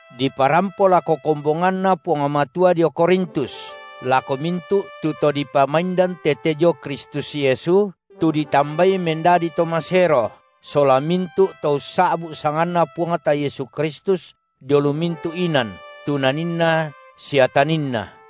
diparampo lako kombonganNa Puang Matua dio Korintus, lako mintu’ tu to dipamaindan tete dio Kristus Yesu, tu ditambai mendadi to masero sola mintu’ to ussa’bu’ sanganNa Puangta Yesu Kristus dio lu mintu’ inan, tu naninna sia taninna.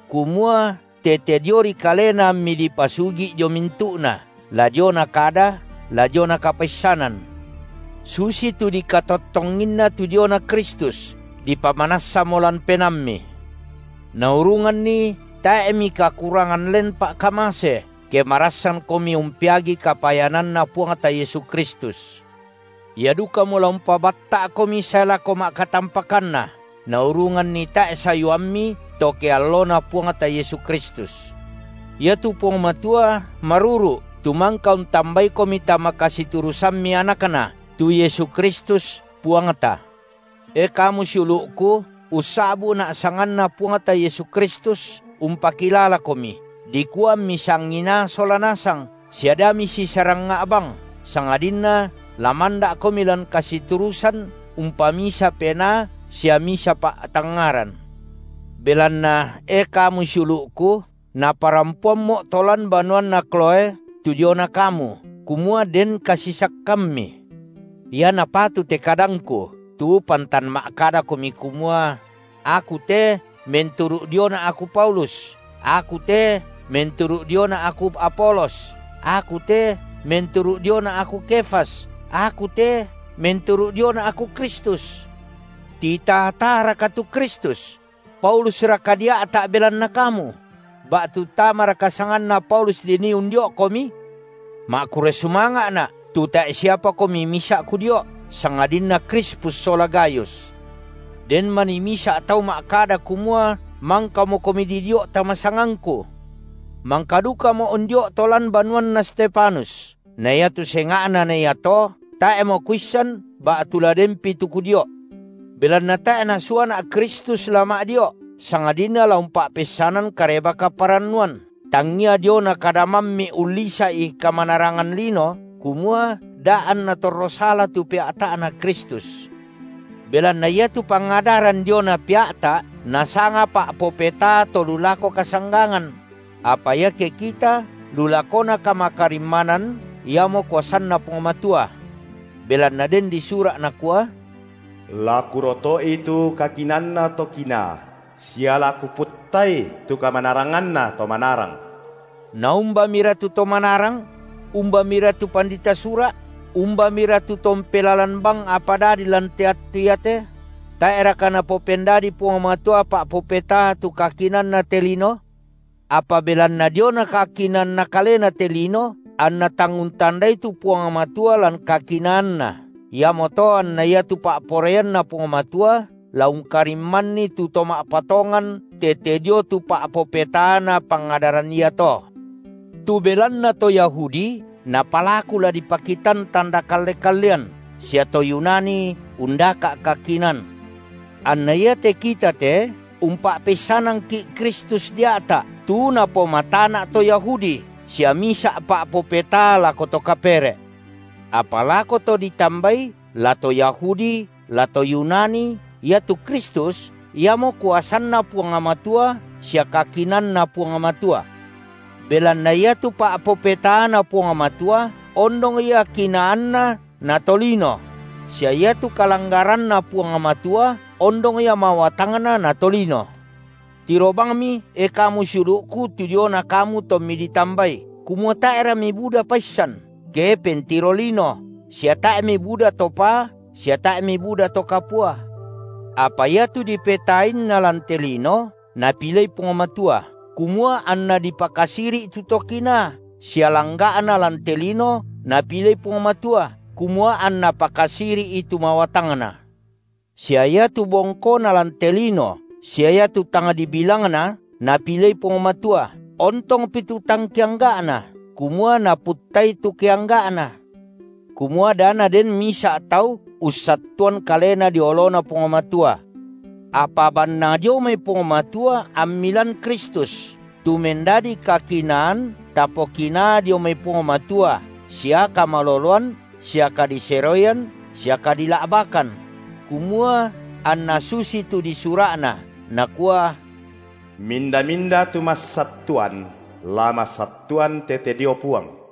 kumua tete diori Kalena ammi dipasugi’ dio mintu’na la diona kada, la diona kapaissanan; susitu dikatottonginna tu diona Kristus dipamanassamo lan penaammi. Naurunganni tae’ mikakurangan len pa’kamase, ke marassankomi umpeagi kapayananNa Puangta Yesu Kristus. Ia dukamo la umpabatta’komi sae lako ma’katampakanna, naurunganni tae’ sayuammi to ke alloNa Puangta Yesu Kristus. Iatu Puang Matua maruru’, tu mangka untambaikomi tama kasiturusammi AnakNa, tu Yesu Kristus, Puangta. E kamu siulu’ku, ussa’bu’na’ sanganNa Puangta Yesu Kristus, umpakilalakomi, dikua ammi sanginaa sola nasang sia da misisarangnga’ bang, sangadinna la manda’komi lan kasiturusan umpamisa penaa sia misa pa’tangngaran. Belanna, e kamu siulu’ku, naparampoammo’ to lan banuanna Kloë tu diona kamu, kumua den kasisakkammi. Ia napatu te kadangku, tu pantan ma’kadakomi kumua: Aku te menturu’ diona’ aku Paulus, aku te menturu’ diona’ aku Apolos, aku te menturu’ diona’ aku Kefas, aku te menturu’ diona’ aku Kristus. Titaa-taaraka tu Kristus? Paulusraka dia’ta’ belanna kamu? Ba’tu tamaraka sanganna Paulus dinii undio’komi? Ma’kurre sumanga’na’, tu tae’ siapakomi misa’ kudio’, sangadinna Krispus sola Gayus, den manii misa’ tau ma’kada kumua mangkamokomi didio’ tama sangangku. Mangka dukamo’ undio’ to lan banuanna Stefanus, na iatu senga’na na iato tae’mo kuissan ba’tu la denpi tu kudio’. Belanna tae’ Nasuana’ Kristus la ma’dio’, sangadinna la umpa’peissanan Kareba-kaparannuan, tangia diona kada mammi’ ullisa’i kamanarangan lino, kumua da’ anna torro sala tu pea’ta’Na Kristus. Belanna iatu pangadaran diona pea’ta’, nasanga pa’popetaa to lu lako kasanggangan; apa iake kita lu lakona kamakarimmanan iamo kuasanNa Puang Matua. Belanna den disura’ nakua: La Kuroto’i tu kakinaanna to kinaa, sia la Kuputtai tu kamanaranganna to manarang. Naumbamira tu to manarang? Umbamira tu pandita Sura’? Umbamira tu to umpelalan bang apa dadi lan te attu iate? Tae’raka Napopendadii Puang Matua pa’popetaa tu kakinaanna te lino? Apa belanna diona kakinaanna kalena te lino anna tang untandai tu Puang Matua lan kakinaanNa, iamoto anna iatu pa’poraianNa Puang Matua la ungkarimmanni tu to ma’patongan tete dio tu pa’popetaana pangadaran iato. Tu belanna to Yahudi napalaku la dipakitan tanda kalle-kallean sia to Yunani undaka’ kakinaan, anna iate kita te umpa’peissanangki’ Kristus dia’ta’, tu napomatana’ to Yahudi sia misa’ pa’popetaa lako to kapere’, apa lako to ditambai, la to Yahudi la to Yunani, iatu Kristus, iamo kuasanNa Puang Matua sia kakinaanNa Puang Matua. Belanna iatu pa’popetaaNa Puang Matua ondong ia kinaanna na to lino; sia iatu kalanggaranNa Puang Matua ondong ia mawatangna na tolino. Tiro bangmi, e kamu siulu’ku, tu diona kamu tommi ditambai, kumua tae’ra mibuda paissan, ke pentiro lino, sia tae’ mibuda to paa sia tae’ mibuda to kapua; apa iatu dipetaainna lan te lino Napilei Puang Matua, kumua anNa pakasiri’i tu to kinaa, sia langga’na lan te lino Napilei Puang Matua, kumua anNa pakasiri’i tu mawatangna, sia iatu bongkona lan te lino sia iatu tang dibilangna Napilei Puang Matua, ontongpi tu tang keangga’na, kumua Naputtai tu keangga’na, kumua da naden misa’ tau ussattuan kalena dio oloNa Puang Matua. Apa bannang dio mai Puang Matua ammi lan Kristus, tu mendadi kakinaan tapokinaa dio mai Puang Matua sia kamaloloan sia kadiseroian sia kadila’bakan; kumua anna susitu disura’na, nakua: Minda-minda tu massattuan, la massattuan tete dio Puang.